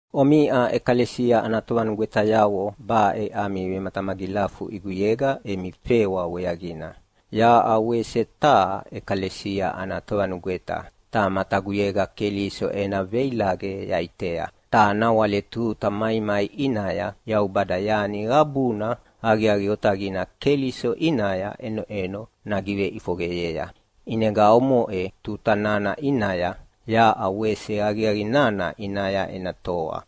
Omiʼa ʼekalesia ana tovanugwetayavo baʼe ami vematamagilafu ʼiguyega emi fewa weaqina. Yaʼa wese taha ʼekalesia ana tovanugweta, ta mataguyega Keliso ena veilaqe yaʼitea. Ta nawale tuta maimai ʼinaya Yaubada yani qabuna aqiaqi otaqina Keliso ʼinaya ʼenoʼeno nagiveʼifoqeyea, ʼinega omoʼe tuta nana ʼinaya yaʼa wese aqiaqi nana ʼinaya ena toa.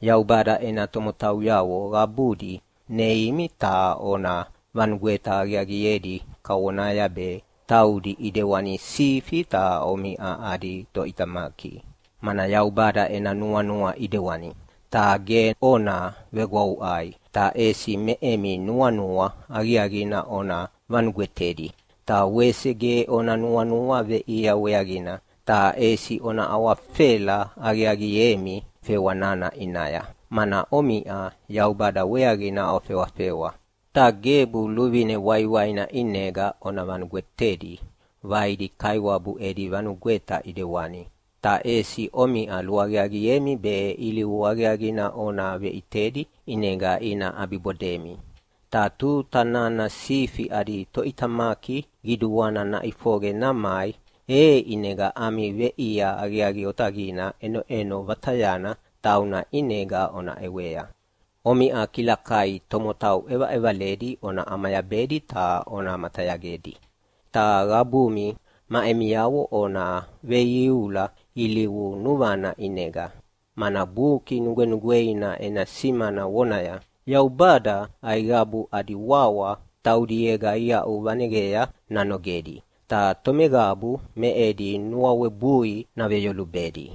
Yaubada ena tomotauyavo qabudi neimi ta ona vanugweta aqiaqiedi kavonaya be taudi ʼidewani sifi ta omiʼa adi toʼitamaki, mana Yaubada ena nuanua ʼidewani. Ta ge ona vegwavuʼai, ta ʼesi me emi nuanua aqiaqina ona vanugwetedi. Ta wese ge ona nuanua veʼia weaqina, ta ʼesi ona awafela aqiaqiemi fewa nana ʼinaya, mana omiʼa Yaubada weaqina ofewafewa. Ta gebu luvine waiwaina ʼinega ona vanugwetedi vaidi kaiwabu edi vanugweta ʼidewani, ta ʼesi omiʼa luaqiaqiemi be ilivu aqiaqina ona veʼitedi ʼinega ina ʼabibodemi. Ta tuta nana sifi adi Toʼitamaki Qiduana naʼifoqe namai, e ʼinega ami veʼia aqiaqi otaqina ʼenoʼeno vatayana tauna ʼinega ona ʼewea. Omiʼa kilakai tomotau ʼevaʼevaledi ona ʼamayabedi ta ona matayagedi. Ta qabumi ma emiavo ona veiuiula ilivu nuvana ʼinega, mana Buki Nugwenugweina ena simana vonaya, “Yaubada aiqabu adi wawa taudiega iaʼuvaneqea nanogedi, ta tomeqabu me edi nuawebui naveyolubedi.”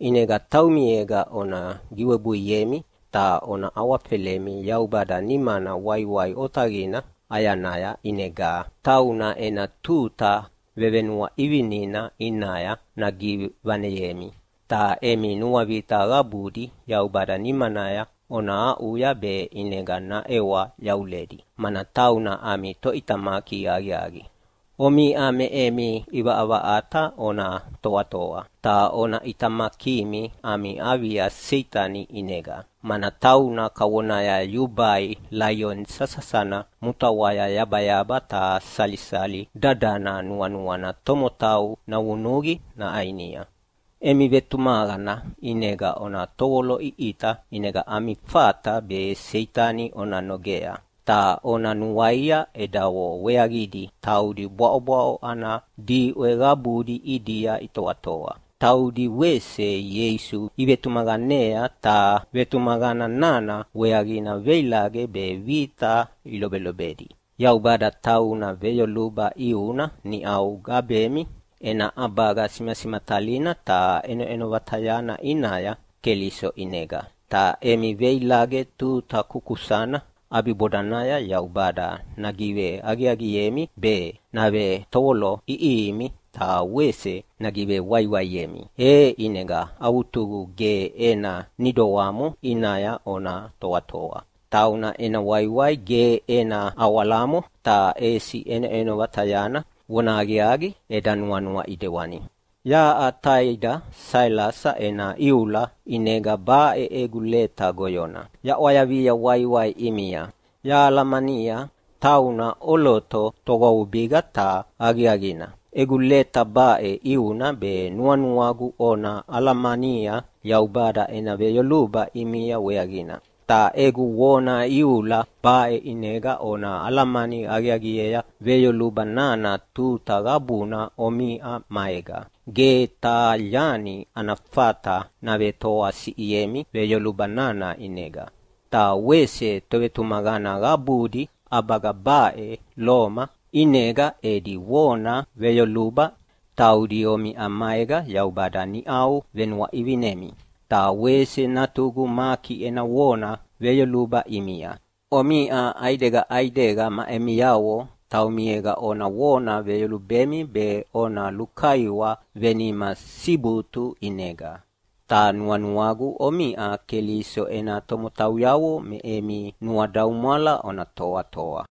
ʼInega taumiega ona giwebuiemi ta ona awafelemi Yaubada nimana waiwai otaqina ʼayanaya, ʼinega tauna ena tuta vevenuaʼivinina ʼinaya nagivaneyemi. Ta emi nuavita qabudi Yaubada nimanaya ona aʼuya be ʼinega naʼewa yavuledi, mana tauna ami Toʼitamaki aqiaqi. Omiʼa me emi ʼivaʼavaʼata ona toatoa, ta ona ʼitamakimi ami avia Seitani ʼinega. Mana tauna kavonaya yubai laioni sasasana mutaʼwaya yabayaba ta salisali dadana nuanuana tomotau navunuqi naʼainia. Emi vetumaqana ʼinega ona tovoloʼiʼita ʼinega ami fata be Seitani ona nogea. Ta ona nuaia edavo weaqidi taudi bwaʼobwaʼo ana diʼwe qabudi ʼidia itoatoa. Taudi wese Ieisu ivetumaqanea ta vetumaqana nana weaqina veilaqe be vita ilobelobedi. Yaubada tauna veyoluba ʼiuna niʼau gabemi ena ʼabaga simasimatalina ta ʼenoʼeno vatayana ʼinaya Keliso ʼinega. Ta emi veilaqe tuta kukusana ʼabibodanaya Yaubada nagiveaqiaqiemi be, navetovolo ʼiʼihimi ta wese nagivewaiwaiemi, e ʼinega avutugu ge ena nidoamo ʼinaya ona toatoa. Tauna ena waiwai ge ena awalamo, ta ʼesi ʼenoʼeno vatayana. Vonahaqiaqi, eda nuanua ʼidewani. Yaʼa taida Sailasa ena iula ʼinega baʼe egu leta goyona yaʼwayavia waiwai ʼimia. Yahalamania tauna ʼoloto togwavubiga ta aqiaqina. Egu leta baʼe ʼiuna be nuanuagu ona alamania Yaubada ena veyoluba ʼimia weaqina. Ta egu vona iula baʼe ʼinega ona alamani aqiaqiea veyoluba nana tuta qabuna omiʼa maega. Ge taha yani ana fata navetoasiʼiemi veyoluba nana ʼinega. Ta wese tovetumaqana qabudi ʼabaga baʼe Loma ʼinega edi vona veyoluba ʼimia. Taudi omiʼa maega Yaubada niʼau venuaʼivinemi. Ta wese natugu Maki ena vona veyoluba ʼimia. Omiʼa ʼaidega ʼaidega ma emiavo taumiega ona vona veyolubemi be ona lukaiwa venima sibutu ʼinega. Ta nuanuagu omiʼa Keliso ena tomotauyavo me emi nuadaumwala ona toatoa.